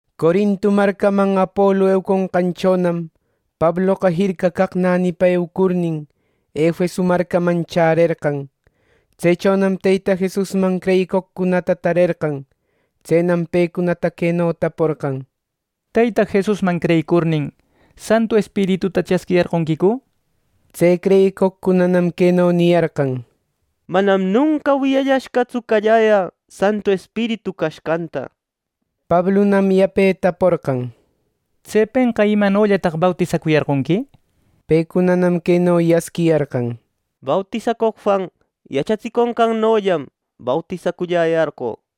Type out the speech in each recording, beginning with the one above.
Corinto marcaman Apolu euconqanchonam Pabloqa jirca caq nänipa eucurnin, Efeso marcaman chärerqan. Tsechonam Teyta Jesusman creyicoqcunata tarerqan. Tsenam pecunata queno taporqan: —Teyta Jesusman creyicurnin, ¿Santu Espirituta chasquiyarqonquicu? —nishpa. Tse creyicoqcunanam queno niyarqan: —Manam nunca wiyayashqatsu calläyä Santu Espiritu cashqanta. Pablunam yape taporqan: —¿Tsepenqa imanollataq bautisacuyarqonqui? —nishpa. Pecunanam queno yasquiyarqan: —Bautisacoq Juan yachatsiconqannollam bautisaculläyarqö —nishpa.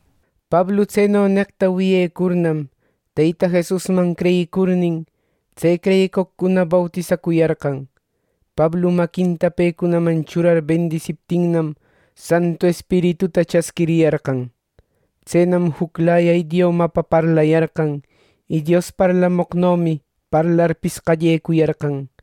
Pablu tseno neqta wiyecurnam, Teyta Jesusman creyicurnin, tse creyicoqcuna bautisacuyarqan. Pablu maquinta pecunaman churar bendisiptinnam Santu Espirituta chasquiriyarqan. Tsenam juclaya idiomapa parlayarqan, y Dios parlamoqnomi parlarpis qallecuyarqan.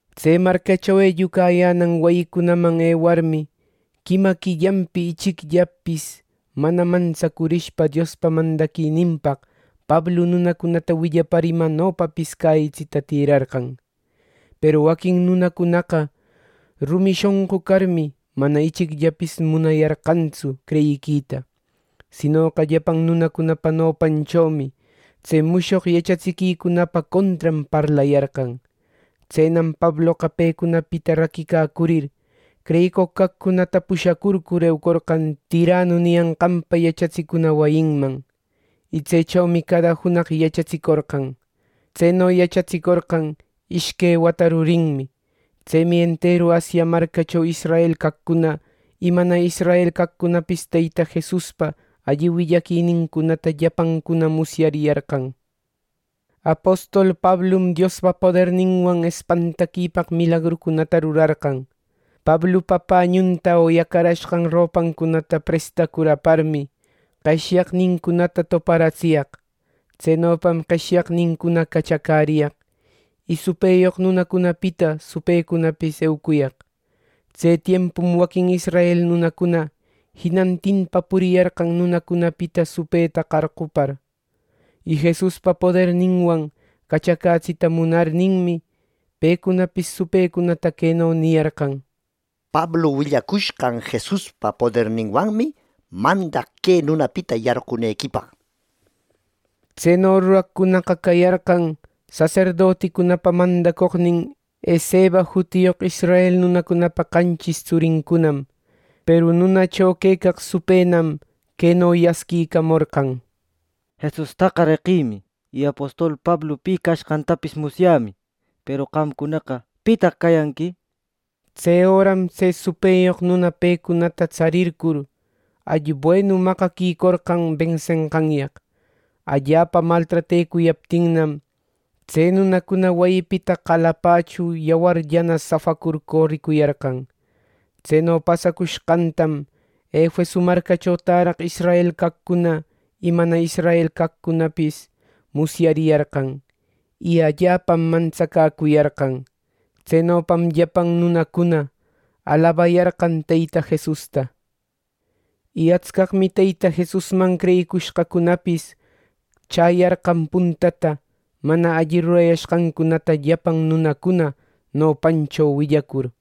Tse marcacho ellucayänan wayicunaman ewarmi, quima quillanpi ichicllapis mana mantsacurishpa Diospa mandaquininpaq Pablu nunacunata willapar imanopapis cäyitsita tirarqan. Peru waquin nunacunanäqa rumi shonqu carmi, mana ichicllapis munayarqantsu creyita, sinoqa llapan nunacunapa nopanchomi tse mushoq yachatsiquicunapa contran parlayarqan. Tsenam Pabloqa pecunapita raquicacurir, creyicoq caqcunata pushacurcur eucorqan Tiranu niyanqanpa yachatsicuna wayinman. Y tsechomi cada junaq yachatsicorqan. Tseno yachatsicorqan ishque wata rurinmi. Tsemi enteru Asia marcacho israel caqcuna y mana israel caqcunapis Teyta Jesuspa alli willaquinincunata llapancuna musyariyarqan. Apostol Pablum Diospa poderninwan espantaquipaq milagrucunata rurarqan. Pablupa pañunta o yacarashqan ropancunata prestacur aparmi, qeshyaqnincunata toparatsiyaq. Tsenopam qeshyaqnincuna cachacäriyaq, y supëyoq nunacunapita supëcunapis eucuyaq. Tse tiempum waquin israel nunacuna jinantinpa puriyarqan nunacunapita supëta qarqupacur. Y Jesuspa poderninwan cachacätsiquita munarninmi, pecunapis supëcunata queno niyarqan: “¡Pablu willacushqan Jesuspa poderninwanmi mandaq que nunapita yarqunequipaq!” nir. Tseno ruraqcunaqa cayarqan saserdoticunapa mandacoqnin Esceva jutiyoq israel nunapa qanchis tsurincunam. Peru nunacho quecaq supënam queno yasquicamorqan: “Jesustaqa reqïmi. Y apostol Pablu pi cashqantapis musyämi; peru qamcunaqa ¿pitaq cayanqui?” nishpa. Tse öram tse supëyoq nuna pecunata tsarircur, allibuenu maqaquicorqan bensenqanyaq. Allapa maltratecuyaptinnam, tse nunacuna wayipita qalapachu yawarllana safacur coricuyarqan. Tseno pasacushqantam Efeso marcacho täraq israel caqcuna y mana israel nunacunapis musyariyarqan, y allapam mantsacäcuyarqan. Tsenopam llapan nunacuna alabayarqan Teyta Jesusta. Y atscaqmi Teyta Jesusman creyicushqacunapis chäyarqan puntata mana alli rurayashqancunata llapan nunacuna nopancho willacur.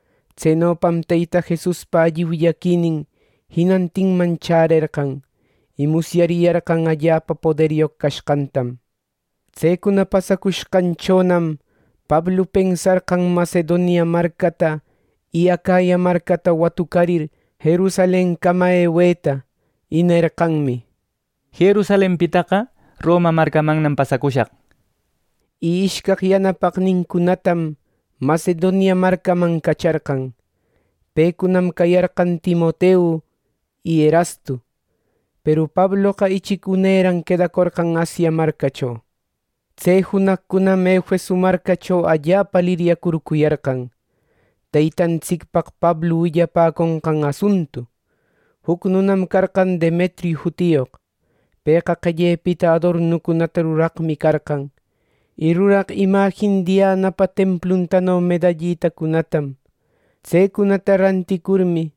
Tsenopam Teyta Jesuspa alli willaquinin jinantinman chärerqan, y musyariyarqan allapa poderyoq cashqanta. Tsecuna pasacushqanchonam Pablu pensarqan Macedonia marcata y Acaya marcata watucarir Jerusalencama eweta. Y nerqanmi, “Jerusalenpitaqa Roma marcamannam pasacushaq” nishpa. Y ishcaq yanapaqnincunatam Macedonia marcaman cacharqan, pecunam cayarqan Timoteu y Erastu. Peru Pabloqa ichic uneran quedacorqan Asia marcacho. Tse junaqcunam Efeso marcacho allapa liryacurcuyarqan, Teytantsicpaq Pablu willapäconqan asuntu. Juc nunam carqan Demetriu jutiyoq. Pëqa qellepita adornucunata ruraqmi carqan. Y ruraq imajin Dianapa templutano medallitacunatam. Tsecunata ranticurmi,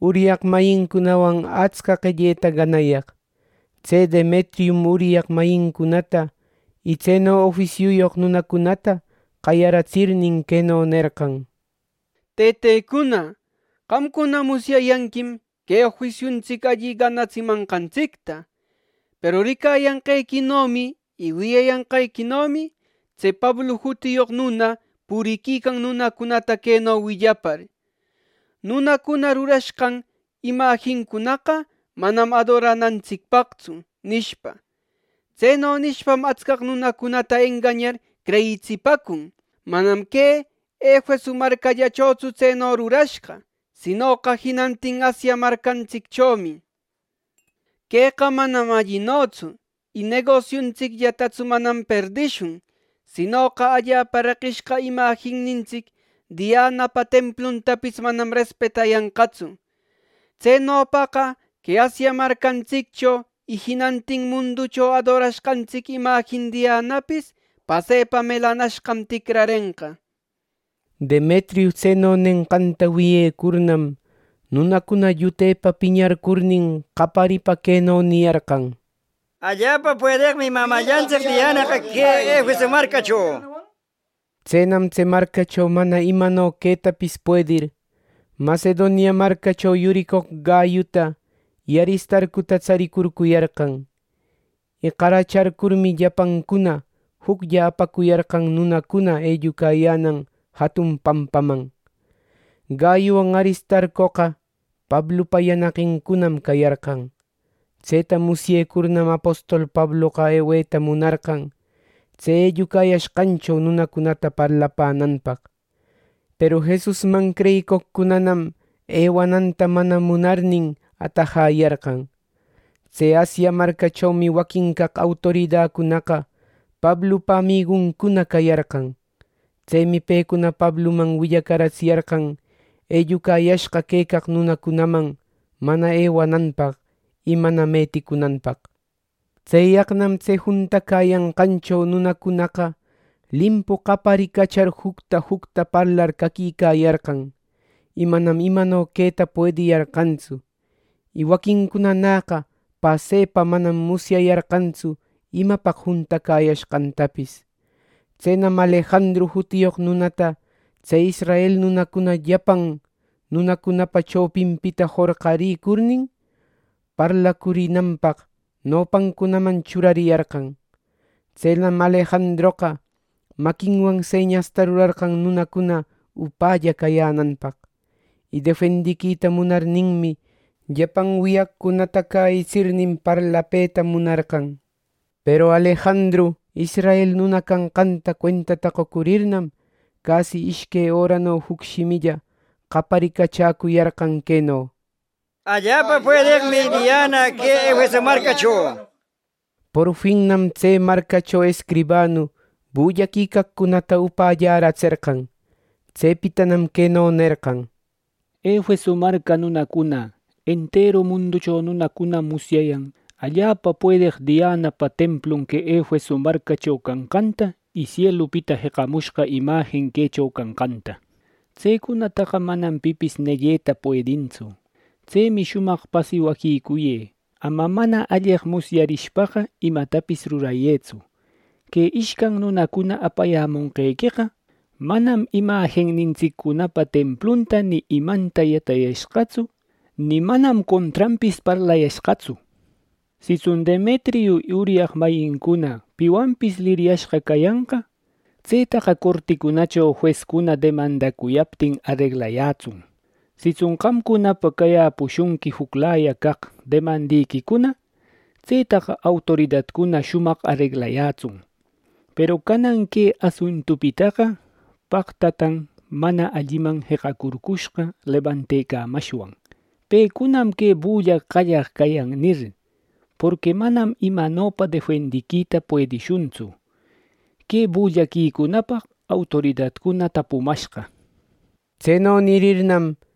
uryaq mayincunawan atsca qelleta ganayaq. Tse Demetrium uryaq mayincunata y tseno ofisiuyoq nunacunata qayaratsirnin queno nerqan: “Tëtecuna, qamcuna musyayanquim que ofisiuntsic alli ganatsimanqantsicta” nir. Peru ricayanqequinomi y wiyayanqequinomi, tse Pablu jutiyoq nuna puriquican nunacunata queno willapar: ‘Nunacuna rurashqan imajincunaqa manam adoranantsicpaqtsu’ nishpa. Tseno nishpam atscaq nunacunata engañar creyitsipäcun. Manam que Efeso marcallachotsu tseno rurashqa; sinoqa jinantin Asia marcantsicchomi. Queqa manam allinotsu. Y negosiuntsicllatatsu manam perdishun, sinoqa allapa reqishqa imajinnintsic Dianapa templuntapis manam respetayanqatsu. Tsenopaqa que Asia marcantsiccho y jinantin munducho adorashqantsic imajin Dianapis pasepa melanashqam ticrarenqa. Demetriu tseno nenqanta wiyecurnam, nunacuna llutepa piñarcurnin qaparipa queno niyarqan: “¡Allapa puedeqmi mamällantsic Dianaqa que Efeso marcacho!” nishpa. Tsenam tse marcacho mana imano quetapis puedir, Macedonia marcacho yuricoq Gayuta y Aristarcuta tsaricurcuyarqan. Y qaracharcurnin, llapancuna juclla apacuyarqan nunacuna ellucayänan jatun pampaman. Gayuwan Aristarcoqa Pablupa yanaqincunam cayarqan. Tseta musyecurnam apostol Pabloqa eweta munarqan, tse ellucayashqancho nunacunata parlapänanpaq, peru Jesusman creyicoqcunanam ˻ewananta mana munarnin˼ atajayarqan. Tse Asia marcachomi waquin caq autoridacunaqa Pablupa amiguncuna cayarqan. Tsemi pecuna Pabluman willacaratsiyarqan ellucayashqa quecaq nunacunaman mana ewananpaq y mana meticunanpaq. Tseyaqnam tse juntacäyanqancho nunacunaqa limpu qaparicachar jucta jucta parlar caquicayarqan, y manam imano queta puediyarqantsu. Y waquincunanäqa pasepa manam musyayarqantsu imapaq juntacäyashqantapis. Tsenam Alejandru jutiyoq nunata tse israel nunacuna llapan nunacunapa chopinpita jorqarïcurnin, parlacurinanpaq nopancunaman churariyarqan. Tsenam Alejandroqa maquinwan señasta rurarqan nunacuna upälla cayänanpaq. Y defendiquita munarninmi llapan wiyaqcunata cäyitsirnin parlapëta munarqan. Peru Alejandru, israel nuna canqanta cuentata qocurirnam, casi ishque örano juc shimilla qaparicachäcuyarqan queno: “¡Allapa puedeqmi Diana que Efeso marcacho!” nishpa. Porfinnam tse marcacho escribanu bullaquicaqcunata upällaratserqan. Tsepitanam queno nerqan: “Efeso marca nunacuna, enteru munducho nunacunam musyäyan allapa puedeq Dianapa templun que Efeso marcacho canqanta y sielupita jeqamushqa imajin quecho canqanta. Tsecunataqa manam pipis negueta puedintsu. Tsemi shumaq pasiwaquicuyë. Ama mana alleq musyarishpaqa imatapis rurayëtsu. Que ishcan nunacuna apayämonqequeqa, manam imajinnintsiccunapa templunta ni imanta yatayashqatsu ni manam contranpis parlayashqatsu. Sitsun Demetriu y uryaq mayincuna piwanpis liryashqa cayanqa, tsetaqa corticunacho juescuna demandacuyaptin areglayätsun. Sitsun qamcunapa cayäpushunqui juclaya caq demandequicuna, tsetaqa autoridacuna shumaq areglayätsun. Peru canan que asuntupitaqa, paqtataq mana alliman jeqacurcushqa lebantecamashwan, ‘Pecunam que bulla qallaq cayan’ nir. Porqui manam imanopa defendiquita puedishuntsu, que bullaquicunapaq autoridacuna tapumashqa” nir.